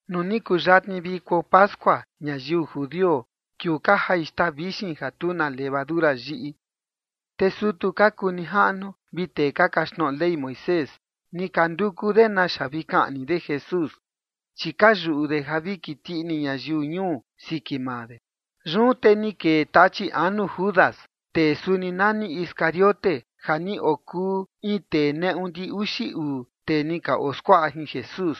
Nuu ni kuyatni viko pascua ñayiu judio, kiuu ka jai xtaa vixin ja tu na levadura yiꞌi, te sutu ka kuu nijaꞌnu vi tee ka kaxtnoꞌo Ley Moisés ni ka nduku de naxa vi kaꞌni de Jesús, chi ka yuꞌu de ja vi kiti ini ñayiu ñuu siki maa de. Yun te ni kee Tachi anu Judas, tee suni nani Iscariote, ja ni okuu in tee neꞌu ndi uxi uu tee ni ka oskuaꞌa jin Jesús.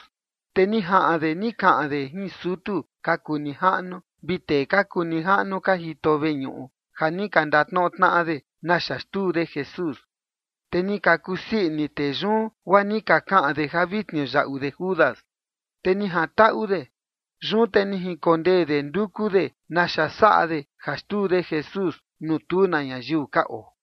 Te ni jaꞌan de ni kaꞌan de jin sutu ka kuu nijaꞌnu vi tee ka kuu nijaꞌnu ka jito veñuꞌu ja ni ka ndatnoꞌo tnaꞌa de naxa xtuu de Jesús. Te ni ka kusii ini tee yun, guaa ni ka kaꞌan de ja vi tniuyaꞌu de Judas. Te ni jantaꞌu de. Yun te ni jinkondee de nduku de naxa saꞌa de ja xtuu de Jesús nuu tu na ñayiu ka oo.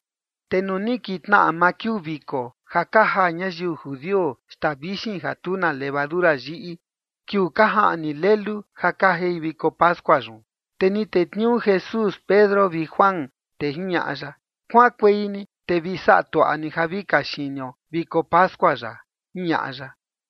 Te nuu ni kintnaꞌa maa kiuu viko ja ka jaa ñayiu judio xtaa vixin ja tu na levadura yiꞌi, kiuu ka jaꞌni lelu ja ka jai viko pascua yun, te ni tetniuu Jesús Pedro vi Juan, te jiñaꞌa ya: ―Kuaꞌankuei ni te vi saꞌa tuaꞌa ni ja vi kaxinio viko pascua yaꞌa ―jiñaꞌa ya.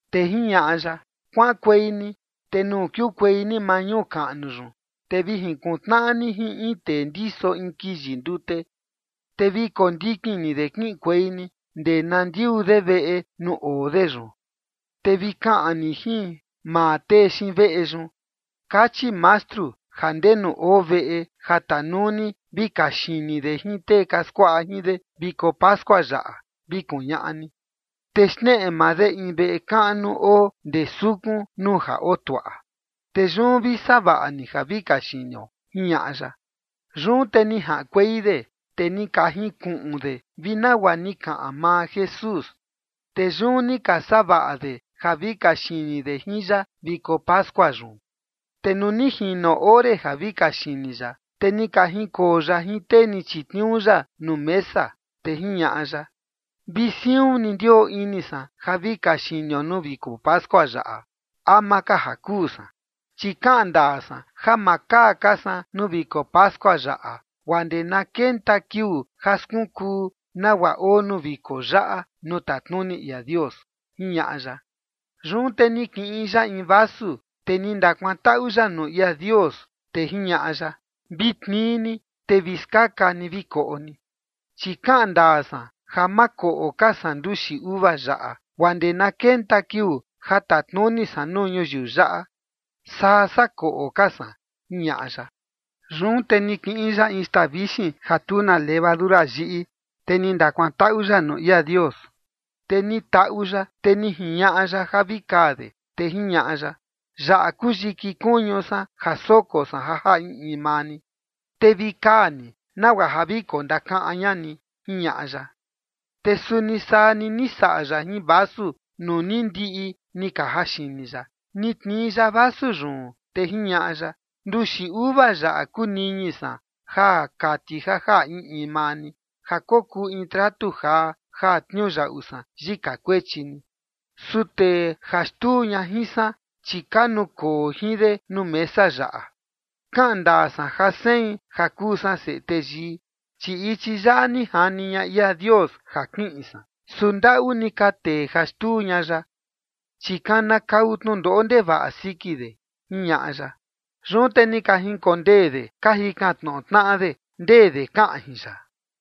Te jiñaꞌa ya: ―Kuaꞌankuei ni te nuu kiukuei ni maa ñuu kaꞌnu yun, te vi jinkuntnaꞌa ni jin in tee ndiso in kiyi ndute. Te vi kondikin ni de kiꞌinkuei ni ndee na ndiuu de veꞌe nuu oo de yun. Te vi kaꞌan ni jin maa tee xiin veꞌe yun: “Kachi Mastru ja ¿ndenu oo veꞌe ja tanuu ni vi kaxini de jin tee ka skuaꞌa jin de viko pascua yaꞌa?”, vi kuñaꞌa ni. Te xneꞌe maa de in veꞌe kaꞌnu oo ndee sukun nuu ja oo tuaꞌa. Te yun vi saꞌa vaꞌa ni ja vi kaxinio ―jiñaꞌa ya. Yun te ni jaꞌankuei de, te ni ka jinkuꞌun de vi nagua ni kaꞌan maa Jesús. Te yun ni ka saꞌa vaꞌa de ja vi kaxini de jin ya viko pascua yun. Te nuu ni jino ore ja vi kaxini ya, te ni ka jinkoo ya jin tee ni chitniuu ya nuu mesa. Te jiñaꞌa ya: ―Vi siun ni ndioo ini san ja vi kaxinio nuu viko pascua yaꞌa ama ka ja kuu san. Chi kaꞌan ndaa san ja ma kaa ka san nuu viko pascua yaꞌa guaa ndee na kenta kiuu ja skunkuu nagua oo nuu viko yaꞌa nuu tatnuni ia Dios ―jiñaꞌa ya. Yun te ni kiꞌin ya in vasu, te ni ndakuantaꞌu ya nuu ia Dios, te jiñaꞌa ya: ―Vi tnii ni, te vi skaka ni vi koꞌo ni. Chi kaꞌan ndaa san ja ma koꞌo ka san nduxi uva yaꞌa guaa ndee na kenta kiuu ja tatnuni san nuu ñuyiu yaꞌa, saa sakoꞌo ka san ―jiñaꞌa ya. Yun te ni kiꞌin ya in xtaa vixin ja tu na levadura yiꞌi, te ni ndakuantaꞌu ya nuu ia Dios, te ni taꞌu ya, te ni jiñaꞌa ya ja vi kaa de, te jiñaꞌa ya: ―Yaꞌa kuu yiki kuñu san ja soko san ja jaꞌa in in maa ni. Te vi kaa ni nagua ja vi kondakaꞌan ña ni ―jiñaꞌa ya. Te suni saa ni ni saꞌa ya jin vasu nuu ni ndiꞌi ni ka jaxini ya. Ni tnii ya vasu yun, te jiñaꞌa ya: ―Nduxi uva yaꞌa kuu niñi san, ja kati ja jaꞌa in in maa ni, ja kokuu in tratu jaa ja tniuyaꞌu san yika kuechi ni. ’Su tee ja xtuu ña jin san, chi ka nukoo jin de nuu mesa yaꞌa. Kaꞌan ndaa san ja sein ja kuu san Seꞌe Teyii, chi ichi yaꞌa ni jani ña ia Dios ja kiꞌin san. Su ndaꞌu ni ka tee ja xtuu ña yaꞌa, chi kanakau tnundoꞌo ndevaꞌa siki de ―jiñaꞌa ya. Yun te ni ka jinkondee de ka jikan tnoꞌo tnaꞌa de ndee de kaꞌan jin ya.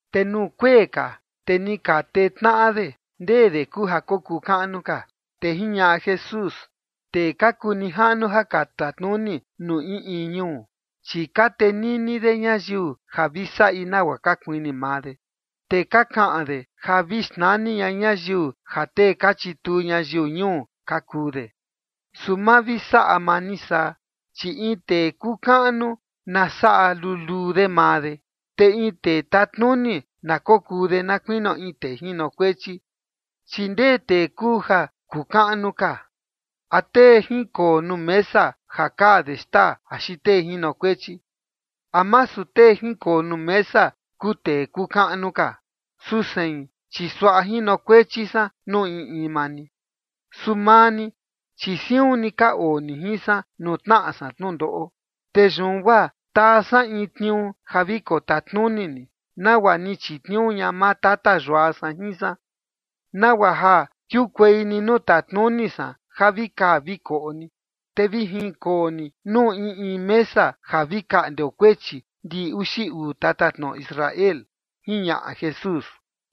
Te nuu kuee ka, te ni ka tee tnaꞌa de ndee de kuu ja kokuu kaꞌnu ka. Te jiñaꞌa Jesús: ―Tee ka kuu nijaꞌnu ja ka tatnuni nuu in in ñuu, chi ka tenini de ñayiu ja vi saꞌi nagua ka kuini maa de. Te ka kaꞌan de ja vi xnani ña ñayiu ja tee ka chituu ñayiu ñuu ka kuu de. Su ma vi saꞌa maa ni saa, chi in tee kuu kaꞌnu na saꞌa luluu de maa de, te in tee tatnuni na kokuu de na kuinio in tee jinokuechi. Chi ¿ndee tee kuu ja kuu kaꞌnu ka? ¿A tee jinkoo nuu mesa ja kaa de xtaa axi tee jinokuechi? ¿A masu tee jinkoo nuu mesa kuu tee kuu kaꞌnu ka? Su sein, chi suaꞌa jinokuechi san nuu in in maa ni. ’Su maa ni, chi siun ni ka oo ni jin san nuu tnaꞌa san tnundoꞌo. Te yun guaa taa san in tniuu ja vi kotatnuni ni, nagua ni chitniuu ña maa Tata Yua san jin san, nagua ja kiukuei ni nuu tatnuni san ja vi kaa vi koꞌo ni. Te vi jinkoo ni nuu in in mesa ja vi kaꞌndeo kuechi ndiꞌi uxi uu tatatnoꞌo Israel ―jiñaꞌa Jesús.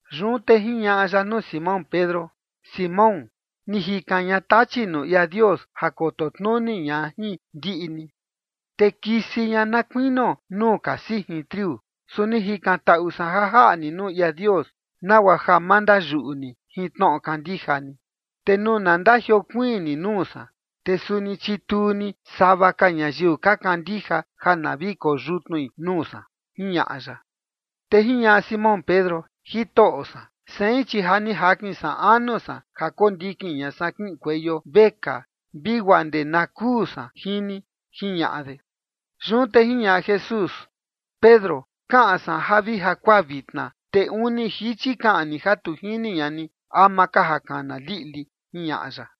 Yun te jiñaꞌa ya nuu Simón Pedro: ―Simón, ni jikan ña Tachi nuu ia Dios ja koto tnuni ña jin ndiꞌi ni, te kisi ña na kuinio nuu ka sijin triu. Su ni jikantaꞌu san ja jaꞌa ni nuu ia Dios, nagua ja ma ndayuꞌu ni jin tnoꞌo kandija ni. Te nuu na ndajiokuiin ni nuu san, te suni chituu ni sava ka ñayiu ka kandija ja na vi koyutnui nuu san ―jiñaꞌa ya. Te jiñaꞌa Simón Pedro: ―Jitoꞌo san, sein chi ja ni jakin san anu san ja kondikin ña san kiꞌinkueio vekaa, vi guaa ndee na kuu san jin ni ―jiñaꞌa de. Yun te jiñaꞌa Jesús: ―Pedro, kaꞌan san ja vi jakuaa vitna, te uni jichi kaꞌan ni ja tu jini ña ni ama ka ja kana liꞌli ―jiñaꞌa ya.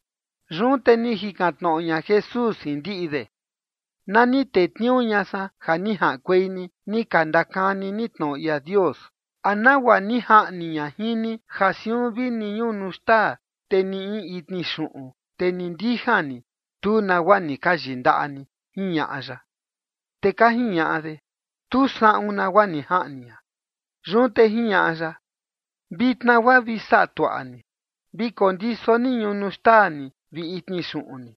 Yun te ni jikan tnoꞌo ña Jesús jin ndiꞌi de: ―Na ni tetniuu ña san ja ni jaꞌankuei ni, ni ka ndakani ni tnoꞌo ia Dios, ¿a nagua ni jaꞌni ña jin ni ja siun vini in ñunu xtaa, te ni in itni xuꞌun, te ni ndijan ni tu nagua ni ka yindaꞌa ni? ―jiñaꞌa ya. Te ka jiñaꞌa de: ―Tu saꞌun nagua ni jaꞌni ña. Yun te jiñaꞌa ya: ―Vitna guaa vi saꞌa tuaꞌa ni. Vi kondiso ni ñunu xtaa ni vi itni xuꞌun ni.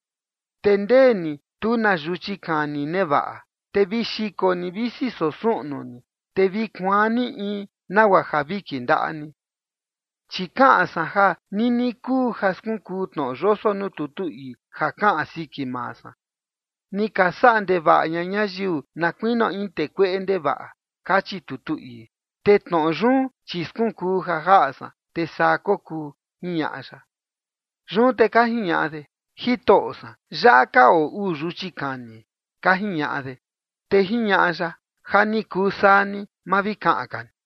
Te ndee ni tu na yuchi kani nevaꞌa, te vi xiko ni visi soo suꞌnu ni, te vi kuaan ni in nagua ja vi kindaꞌa ni. Chi kaꞌan san ja nini kuu ja skunkuu tnoꞌo yoso nuu tutu ii ja kaꞌan siki maa san: “Ni ka saꞌa ndevaꞌa ña ñayiu na kuinio in tee kueꞌe ndevaꞌa”, kachi tutu ii. Te tnoꞌo yun, chi skunkuu ja jaꞌa san, te saa kokuu ―jiñaꞌa ya. Yun te ka jiñaꞌa de: ―Jitoꞌo san, yaꞌa ka oo uu yuchi kani ―ka jiñaꞌa de. Te jiñaꞌa ya: ―Ja ni kuu saa ni. Ma vi kaꞌan ka ni.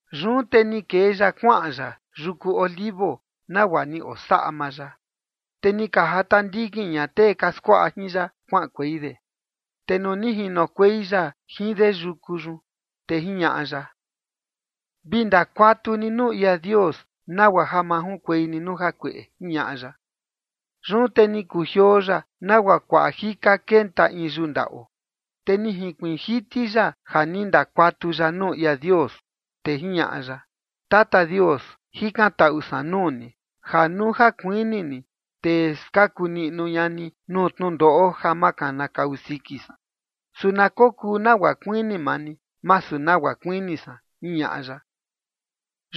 Yun te ni kee ya kuaꞌan ya yuku Olivos nagua ni osaꞌa maa ya. Te ni ka jata ndikin ña tee ka skuaꞌa jin ya kuaꞌankuei de. Te nuu ni jinokuei ya jin de yuku yun, te jiñaꞌa ya: ―Vi ndakuatu ni nuu ia Dios nagua ja ma junkuei ni nuu jakueꞌe ―jiñaꞌa ya. Yun te ni kujioo ya nagua kuaꞌa jika kenta in yuu ndaꞌo. Te ni jinkuiin jiti ya ja ni ndakuatu ya nuu ia Dios, te jiñaꞌa ya: ―Tata Dios, jikantaꞌu san nuu ni ja nuu ja kuini ni, te skaku niꞌnu ña ni nuu tnundoꞌo ja ma kanakau siki san. Su na kokuu nagua kuini maa ni, masu nagua kuini san ―jiñaꞌa ya.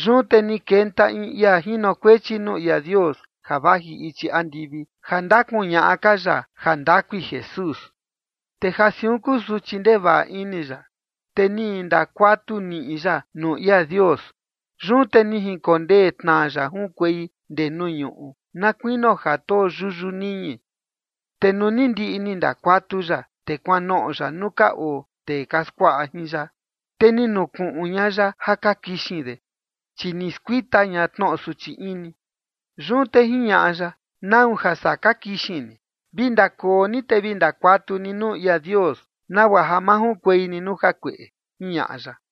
Yun te ni kenta in ia jinokuechi nuu ia Dios ja vaji ichi andivi, ja ndakuñaꞌa ka ya jandakui Jesús. Te ja siun kusuchi ndevaꞌa ini ya, te ni ndakuatu niꞌi ya nuu ia Dios. Yun te ni jinkondee tnaa ya junkuei ndee nuu ñuꞌu na kuinio ja too yuyu niñi. Te nuu ni ndiꞌi ni ndakuatu ya, te kuanoꞌo ya nuu ka oo tee ka skuaꞌa jin ya, te ni nukuꞌun ña ya ja ka kixin de, chi ni skuita ña tnoꞌo suchi ini. Yun te jiñaꞌa ya: ―¿Nau ja saa ka kixin ni? Vi ndakoo ni te vi ndakuatu ni nuu ia Dios nagua ja ma junkuei ni nuu jakueꞌe ―jiñaꞌa ya.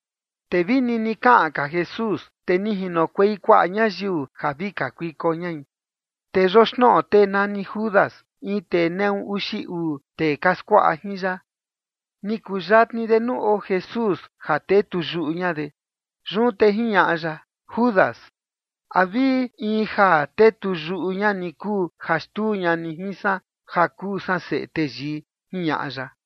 Te vi nini kaꞌan ka Jesús, te ni jinokuei kuaꞌa ñayiu ja vi kakuiko ñai, te yoxnoꞌo tee nani Judas, in tee neꞌu uxi uu tee ka skuaꞌa jin ya. Ni kuyatni de nuu oo Jesús ja tetuyuꞌu ña de. Yun te jiñaꞌa ya: ―Judas, ¿a vi in ja tetuyuꞌu ña ni kuu ja xtuu ña ni jin san ja kuu san Seꞌe Teyii? ―jiñaꞌa ya.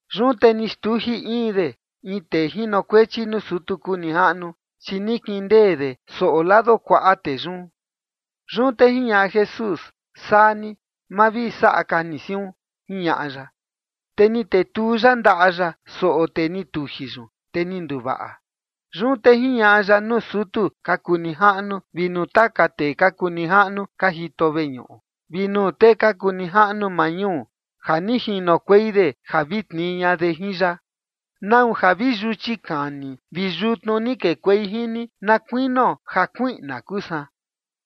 Yun te ni xtuji in de in tee jinokuechi nuu sutu kuu nijaꞌnu, chi ni kindee de soꞌo lado kuaꞌa tee yun. Yun te jiñaꞌa Jesús: ―Saa ni, ma vi saꞌa ka ni siun ―jiñaꞌa ya. Te ni tetuu ya ndaꞌa ya soꞌo tee ni tuji yun, te ni nduvaꞌa. Yun te jiñaꞌa ya nuu sutu ka kuu nijaꞌnu vi nuu taka tee ka kuu nijaꞌnu ka jito veñuꞌu, vi nuu tee ka kuu nijaꞌnu maa ñuu ja ni jinokuei de ja vi tnii ña de jin ya: ―¿Nau ja vi yuchi kani vi yutnu ni kekuei jin ni na kuinio ja kuiꞌna kuu san?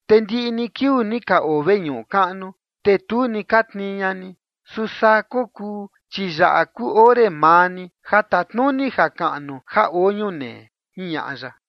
Te ndiꞌi ni kiuu ni ka oo veñuꞌu kaꞌnu, te tu ni ka tnii ña ni. Su saa kokuu, chi yaꞌa kuu ore maa ni, ja tatnuni jakaꞌnu ja oo ñunee ―jiñaꞌa ya.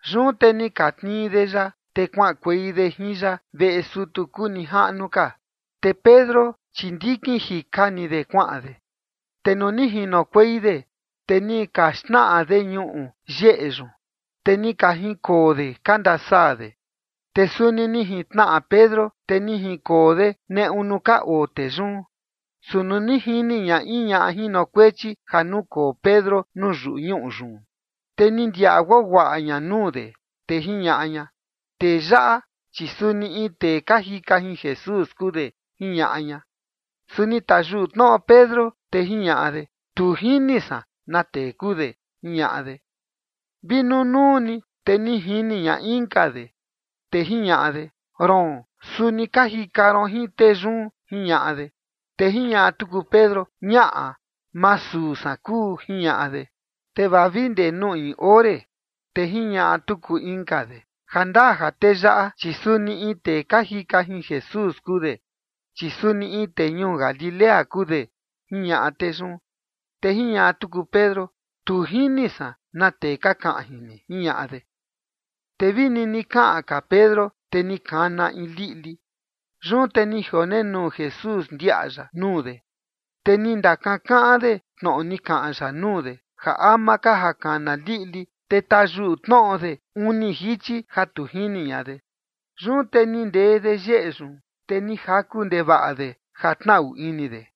Yun te ni ka tnii de ya, te kuaꞌankuei de jin ya veꞌe sutu kuu nijaꞌnu ka. Te Pedro, chi ndikin jika ni de, kuaꞌan de. Te nuu ni jinokuei de, te ni ka xtnaꞌa de ñuꞌu yeꞌe yun, te ni ka jinkoo de ka ndasaa de. Te suni ni jintnaꞌa Pedro, te ni jinkoo de neꞌu nuu ka oo tee yun. Su nuu ni jini ña in ñaꞌa jinokuechi ja nukoo Pedro nuu yuñuꞌu yun, te ni ndiaꞌa guaguaꞌa ña nuu de, te jiñaꞌa ña: ―Tee yaꞌa, chi suni in tee ka jika jin Jesús kuu de ―jiñaꞌa ña. Su ni tayuꞌu tnoꞌo Pedro, te jiñaꞌa de: ―Tu jini san na tee kuu de ―jiñaꞌa de. Vi nunuu ni, te ni jini ña inka de, te jiñaꞌa de: ―Roon, suni ka jika ron jin tee yun ―jiñaꞌa de. Te jiñaꞌa tuku Pedro: ―Ñaꞌa, ma suu san kuu ―jiñaꞌa de. Te vaa vi ndee nuu in ore, te jiñaꞌa tuku inka de: ―Ja ndaa ja tee yaꞌa, chi suni in tee ka jika jin Jesús kuu de, chi suni in tee ñuu Galilea kuu de ―jiñaꞌa tee yun. Te jiñaꞌa tuku Pedro: ―Tu jini san na tee ka kaꞌan jin ni ―jiñaꞌa de. Te vi nini kaꞌan ka Pedro, te ni kana in liꞌli. Yun te ni jionenuu Jesús, ndiaꞌa ya nuu de, te ni ndakankaꞌan de tnoꞌo ni kaꞌan ya nuu de, ja ama ka ja kana liꞌli, te tayuꞌu tnoꞌo de uni jichi ja tu jini ña de. Yun te ni ndee de yeꞌe yun, te ni jaku ndevaꞌa de ja tnaꞌu ini de.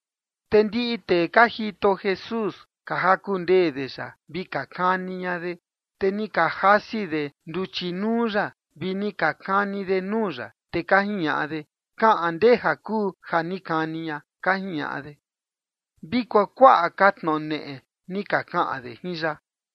Te ndiꞌi tee ka jito Jesús, ka jaku ndee de ya vi ka kani ña de. Te ni ka jasi de nduchi nuu ya, vi ni ka kani de nuu ya, te ka jiñaꞌa de: ―Kaꞌan, ndeja kuu ja ni kani ña ―ka jiñaꞌa de. Vi kuakuaꞌa ka tnoꞌo neꞌe ni ka kaꞌan de jin ya.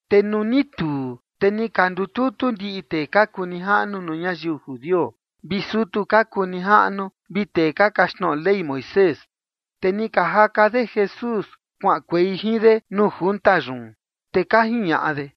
Te nuu ni tuu, te ni ka ndututu ndiꞌi tee ka kuu nijaꞌnu nuu ñayiu judio, vi sutu ka kuu nijaꞌnu, vi tee ka kaxtnoꞌo Ley Moisés, te ni ka jaka de Jesús kuaꞌankuei jin de nuu junta yun, te ka jiñaꞌa de: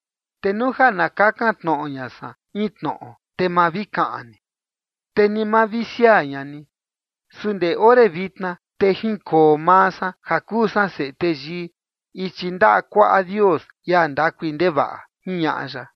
Te nuu ja na kakan tnoꞌo ña san in tnoꞌo, te ma vi kaꞌan ni, te ni ma vi siaa ña ni. Su ndee ore vitna, te jinkoo maa san, ja kuu san Seꞌe Teyii, ichi ndaꞌa kuaꞌa Dios, ia ndakui ndevaꞌa ―jiñaꞌa ya.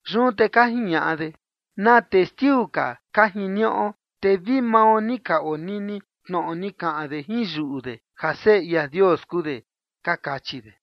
Yun te ka jiñaꞌa de: ―¿Na testiu ka ka jiniuꞌo? Te vi mao ni ka onini tnoꞌo ni kaꞌan de jin yuꞌu de, ja Seꞌe ia Dios kuu de ―ka kachi de.